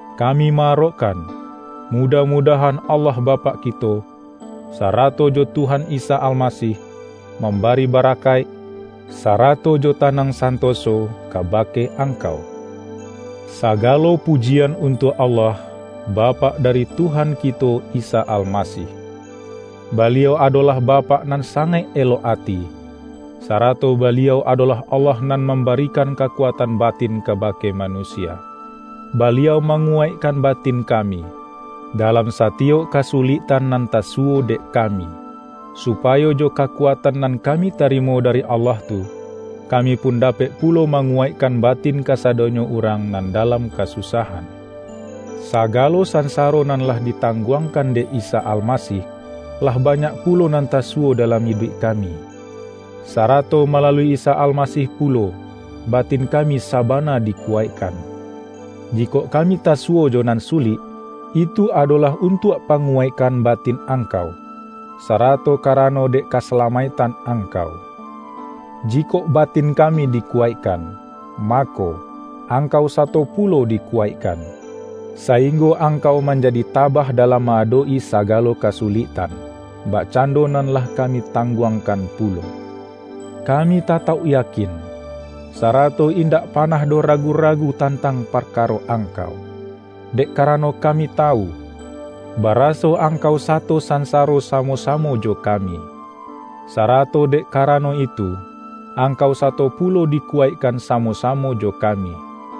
kami ma-arokkan, mudah-mudahan Allah Bapak kito, sarato jo Tuhan Isa Alma-sih, mambari barakaik, sarato jo ta-nang santoso kabake angkau. Sagalo pujian untuak Allah, Bapak dari Tuhan kito Isa Almasih. Baliau adolah Bapak nan sangaik elok ati, sa-rato Baliau adolah Allah nan mamba-rikan kakuatan batin kabake manusia. Baliau manguwaikkan batin kami, dalam satiyok kasuliktan nan tasu-wo dek kami, supayo jo kakuatan nan kami tarimo dari Allah tu, kami pun dapek pulo manguwaikkan batin ka-sadonyo urang nan dalam kasusahan. Sagalo sansaro nan lah ditangguang-kan dek Isa Almasih, lah banyak pulo nan tasuwo dalam iduik kami. Sarato malalui Isa Almasih pulo, batin kami sabana dikuwaikkan. Jikok kami ta-suwo jo nan sulik, itu adolah untuak panguwaikkan batin angkau, sarato karano dek kasalamaiktan angkau. Jikok batin kami dikuwaikkan, ma-ko, angkau sato pulo dikuwaikkan, sainggo angkau manjadi tabah dalam ma-adok-i sagalo kasuliktan, bakcan-do nan lah kami tangguangkan pulo. Kami tatauk yakin, sarato indak panah doh ragu-ragu tantang parkaro angkau, dek karano kami tawu, ba-raso angkau sato sansaro samo-samo jo kami. Sarato dek karano itu, ang-kau sato pulo dikuwaikkan samo-sa-mo jo kami.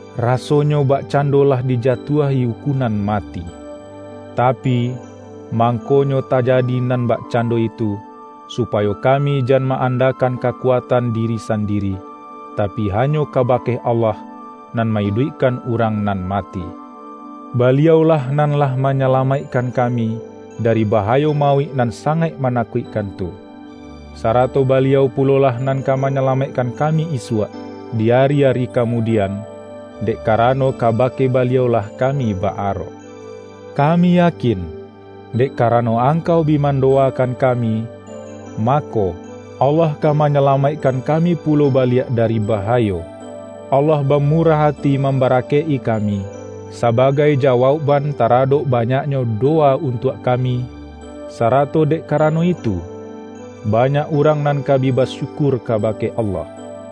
rasonyo bakcando lah dijatuahi ukunan mati. Tapi, mang-konyo tajadi nan bakcando itu, supayo kami jan ma-andakan kakuatan diri sandiri, tapi hanyo kabake Allah, nan ma-iduikkan urang nan mati. Baliau-lah nan lah manyalamaikkan kami, dari bahayo mauik nan sangaik ma-nakuikkan tu. Sarato Baliau pulolah nan ka manyalamaikkan kami isuak di ari-ari kamudian, dek karano ka-bake Baliau-lah kami ba-arok. Kami yakin, dek karano angkau bi mando-wakan kami, mako, Allah ka manya-lamaikkan kami pulo baliak dari baha-yo. Allah bamurah ati mambarakaik-i kami, sabagai jawaukban taradok ba-nyaknyo dowa untuak kami, sarato dek karano itu, banyak urang nan ka bi basyukur kabake Allah.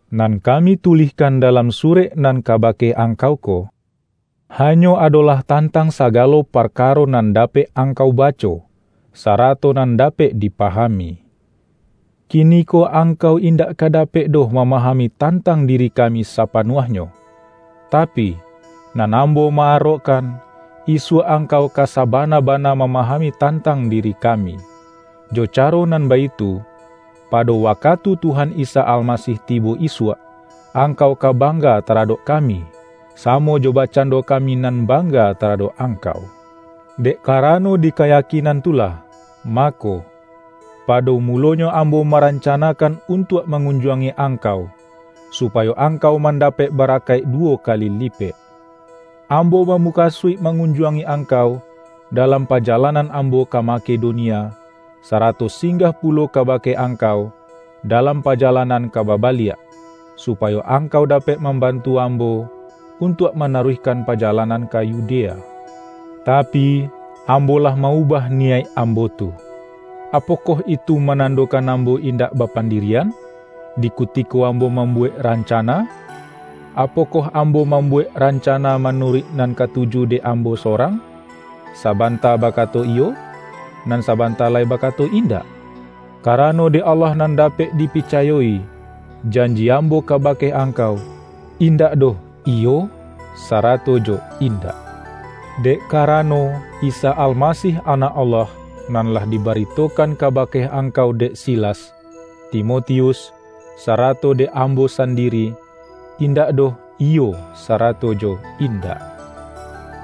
Nan kami tulihkan dalam surek nan ka-bake angkau ko, hanyo adolah tan-tang sagalo parkaro nan dapek ang-kau baco, sarato nan dapek dipahami. Kiniko angkau indak ka dapek doh mamahami tantang diri kami sapa-nuahnyo, tapi, nan ambo ma-arokkan, isuak angkau ka sabana-bana mama-hami tantang diri kami. Jo caro nan baitu, pado wakatu Tuhan Isa Alma-sih tibo isuak, angkau ka bangga ta-radok kami, samo jo bakcando kami nan bangga taradok angkau. Dek karano di kayakinan tu lah, mako, pado mulonyo ambo maranca-nakan untuak mangunjuangi angkau, supayo angkau mandapek barakaik du-wo kali lipek. Ambo bamukasuik ma-ngunjuangi angkau, dalam pajalanan ambo ka Makedonia, sarato singgah pulo kabake angkau dalam pajalan-an ka babaliak, supayo angkau dapek mambantu ambo, untuak manaruihkan pajalanan ka Yudea. Tapi, ambo lah ma-ubah niyaik ambo tu; apokoh itu manandokan ambo indak bapandiri-an? Di kutiko ambo mambuwek ran-cana, apokoh ambo mambuwek ran-cana manuruik nan katuju dek ambo sorang, sabanta bakato,”Iyo”, nan sa-banta lai bakato”Indak"? Karano dek Allah nan dapek dipicayo-i, janji ambo kabake angkau, indak doh”Iyo”, sarato jo”Indak.” Dek karano, Isa Almasih Anak Allah, nan lah dibari-tokan kabake angkau dek Silas, Timo-tius, sarato dek ambo sandiri, indak doh”Iyo" sarato jo”Indak”.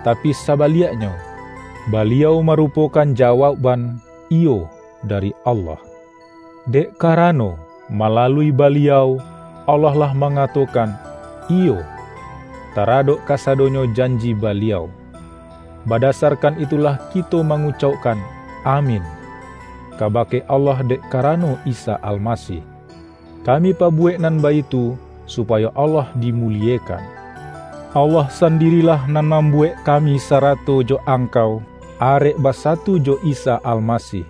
Tapi sa-baliaknyo, Baliau marupokan jawauk-ban”Iyo”, dari Allah. Dek karano, malalui Baliau, Allah lah mangatokan”Iyo", taradok kasadonyo janji Baliau. Badasarkan itulah kito mangucaukkan”Amin" kabake Allah dek karano Isa Almasih. Kami pabuwek nan baitu su-payo Allah dimuliekan. Allah san-dirilah nan mambuwek kami sarato jo angkau, arek basatu jo Isa Almasih;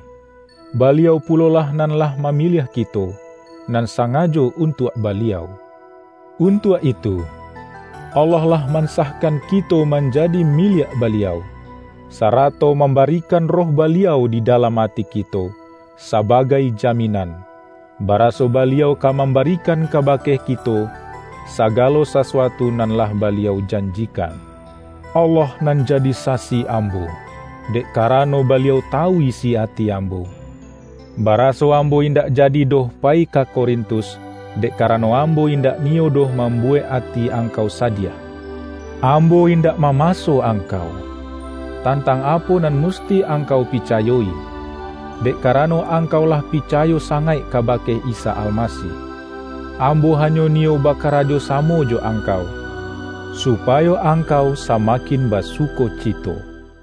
Baliau pulolah nan lah mamiliah kito, nan sangajo untuak Baliau. Untuak itu, Allah lah mansahkan kito manja-di miliak Baliau, sarato mambarikan Roh Baliau di dalam ati kito sabagai jaminan, baraso Baliau ka mambari-kan kabake kito, sagalo sasuatu nan lah Baliau janjikan. Allah nan jadi sasi ambo - dek karano Baliau tawu isi ati ambo - ba-raso ambo indak jadi doh payi ka Ko-rintus, dek karano ambo indak niyo doh mambuwek ati angkau sadiah. Ambo indak mamaso angkau, tan-tang apo nan musti angkau picayo-i, dek karano angkau lah picayo sangaik kabake Isa Almasih. Ambo hanyo ni-yo bakarajo samo jo angkau, supayo angkau samakin basukocito.